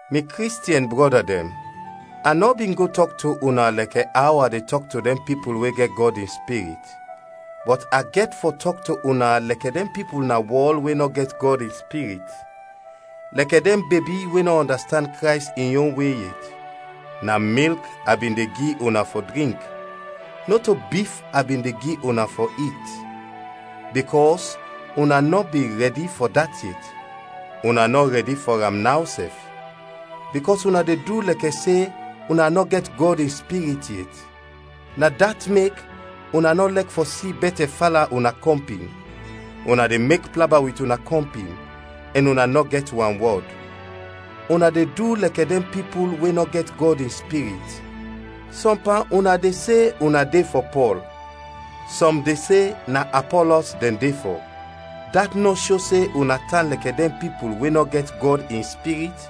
Mi Kristiɛn brɔda dɛn, a nɔ bin go tɔk to una lɛkɛ aw a de tɔk to dɛn pipul we gɛt Gɔd in Spirit, bɔt a gɛt fɔ tɔk to una lɛkɛ dɛn pipul na wɔl we nɔ gɛt Gɔd in Spirit, lɛkɛ dɛn bebi we nɔ ɔndastand Krays in yon we yet. Na milk a bin de gi una fɔ drink, nɔto bif a bin de gi una fɔ it, bikɔs una nɔ bin rɛdi fɔ dat yet. Una nɔ rɛdi fɔ am naw sɛf, bikɔs una de du lɛkɛ se una nɔ gɛt Gɔd in Spirit yet. Na dat mek una nɔ lɛk fɔ si bɛtɛ fala una kɔmpin, una de mek plaba wit una kɔmpin, ɛn una nɔ gɛt wanwɔd! Una de du lɛkɛ dɛn pipul we nɔ gɛt Gɔd in Spirit! Sɔm pan una de se una de fɔ Pɔl, sɔm de se na Apɔlɔs dɛn de fɔ; dat nɔ sho se una tan lɛkɛ dɛn pipul we nɔ gɛt Gɔd in Spirit?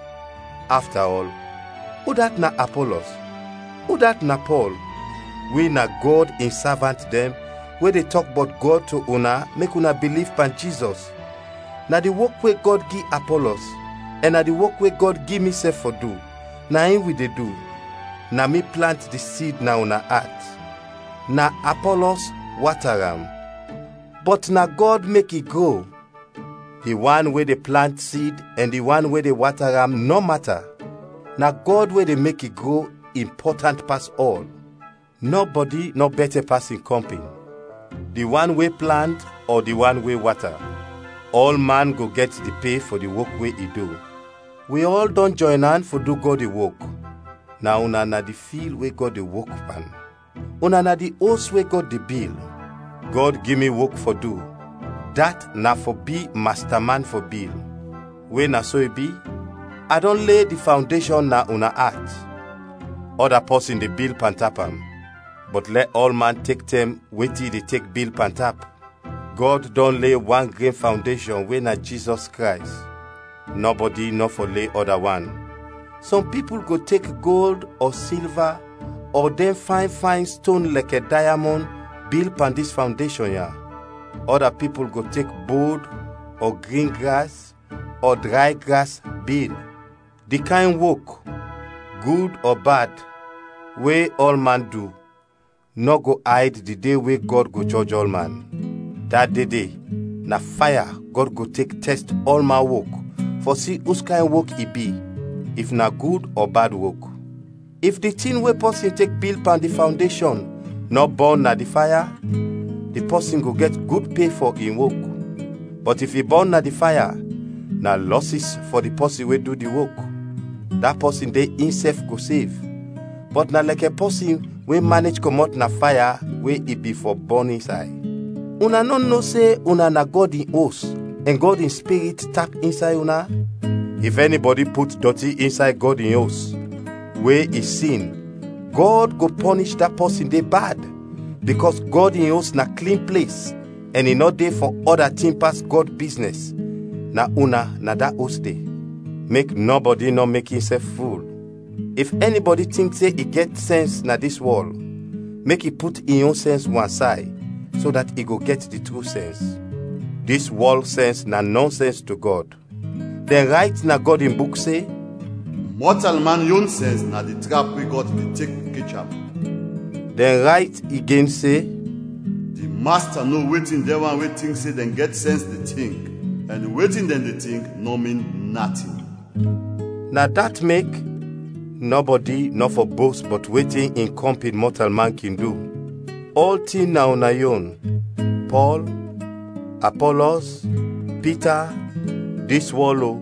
Afta ɔl, udat na Apɔlɔs? Udat na Pɔl? Wi na Gɔd in savant dɛn we de tɔk bɔt Gɔd to una mek una biliv pan Jizɔs, na di wok we Gɔd gi Apɔlɔs, ɛn na di wok we Gɔd gi misɛf fɔ du, na in wi de du. Na mi plant di sid na una at; na Apɔlɔs wata am; bɔt na Gɔd mek i gro. Di wan we de plant sid ɛn di wan we de wata am nɔ mata; na Gɔd we de mek i gro, impɔtant pas ɔl. Nɔbɔdi nɔ bɛtɛ pas in kɔmpin, di wan we plant ɔ di wan we wata; ɔlman go gɛt di pe fɔ di wok we i du. Wi ɔl dɔn jɔyn an fɔ du Gɔd in wok; na una na di fil we Gɔd de wok pan. Una na di os we Gɔd de bil. Gɔd gi mi wok fɔ du, dat na fɔ bi masta man fɔ bil. We na so i bi, a dɔn le di fawndeshɔn na una at, ɔda pɔsin de bil pantap am. Bɔt lɛ ɔlman tek tɛm wetin i de tek bil pantap. Gɔd dɔn le wan gren fawndeshɔn we na Jizɔs Krays; nɔbɔdi nɔ fɔ le ɔda wan. Sɔm pipul go tek gold ɔ silva ɔ dɛn fayn fayn ston lɛkɛ dayamɔn bil pan dis fawndeshɔn ya; ɔda pipul go tek bod ɔ grin gras ɔ dray gras, bil. Di kayn wok, gud ɔ bad, we ɔlman du, nɔ go ayd di de we Gɔd go jɔj ɔlman. Da de de na faya Gɔd go tek tɛst ɔlman wok fɔ si uskayn wok i bi, if na gud ɔ bad wok. If di tin we pɔsin tek bil pan di fawndeshɔn nɔ bɔn na di faya, di pɔsin go gɛt gud pe fɔ in wok. Bɔt if i bɔn na di faya, na lɔsis fɔ di pɔsin we du di wok; da pɔsin de insɛf go sev, bɔt na lɛkɛ pɔsin we manej kɔmɔt na faya we i bin fɔ bɔn insay. Una nɔ no se una na Gɔd in Os ɛn Gɔd in Spirit tap insay una? If ɛnibɔdi put dɔti insay Gɔd in Os, we i sin, Gɔd go pɔnish da pɔsin de bad, bikɔs Gɔd in Os na klin ples ɛn i nɔ de fɔ ɔda tin pas Gɔd biznɛs, na una na da os de. Mek nɔbɔdi nɔ mek insɛf ful. If ɛnibɔdi tink se in gɛt sɛns na dis wɔl, mek i put in yon sɛns wansay, so dat i go gɛt di tru sɛns. Dis wɔl sɛns na nɔnsɛns to Gɔd. Dɛn rayt na Gɔd in Buk se, “Mɔtalman yon sɛns na di trap we Gɔd de tek kech am.” Dɛn rayt igen se, “Di Masta no wetin dɛn wan we tink se dɛn gɛt sɛns de tink, ɛn wetin dɛn de tink nɔ min natin.” Na dat mek, nɔbɔdi nɔ fɔ bost bɔt wetin in kɔmpin mɔtalman kin du. Ɔltin na una yon: Pɔl, Apɔlɔs, Pita, dis wɔl o,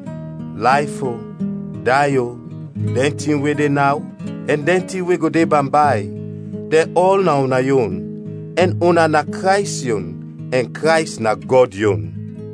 layf o, day o, dɛn tin we de naw, ɛn dɛn tin we go de bambay: dɛn ɔl na una yon, ɛn una na Krays yon ɛn Krays na Gɔd yon.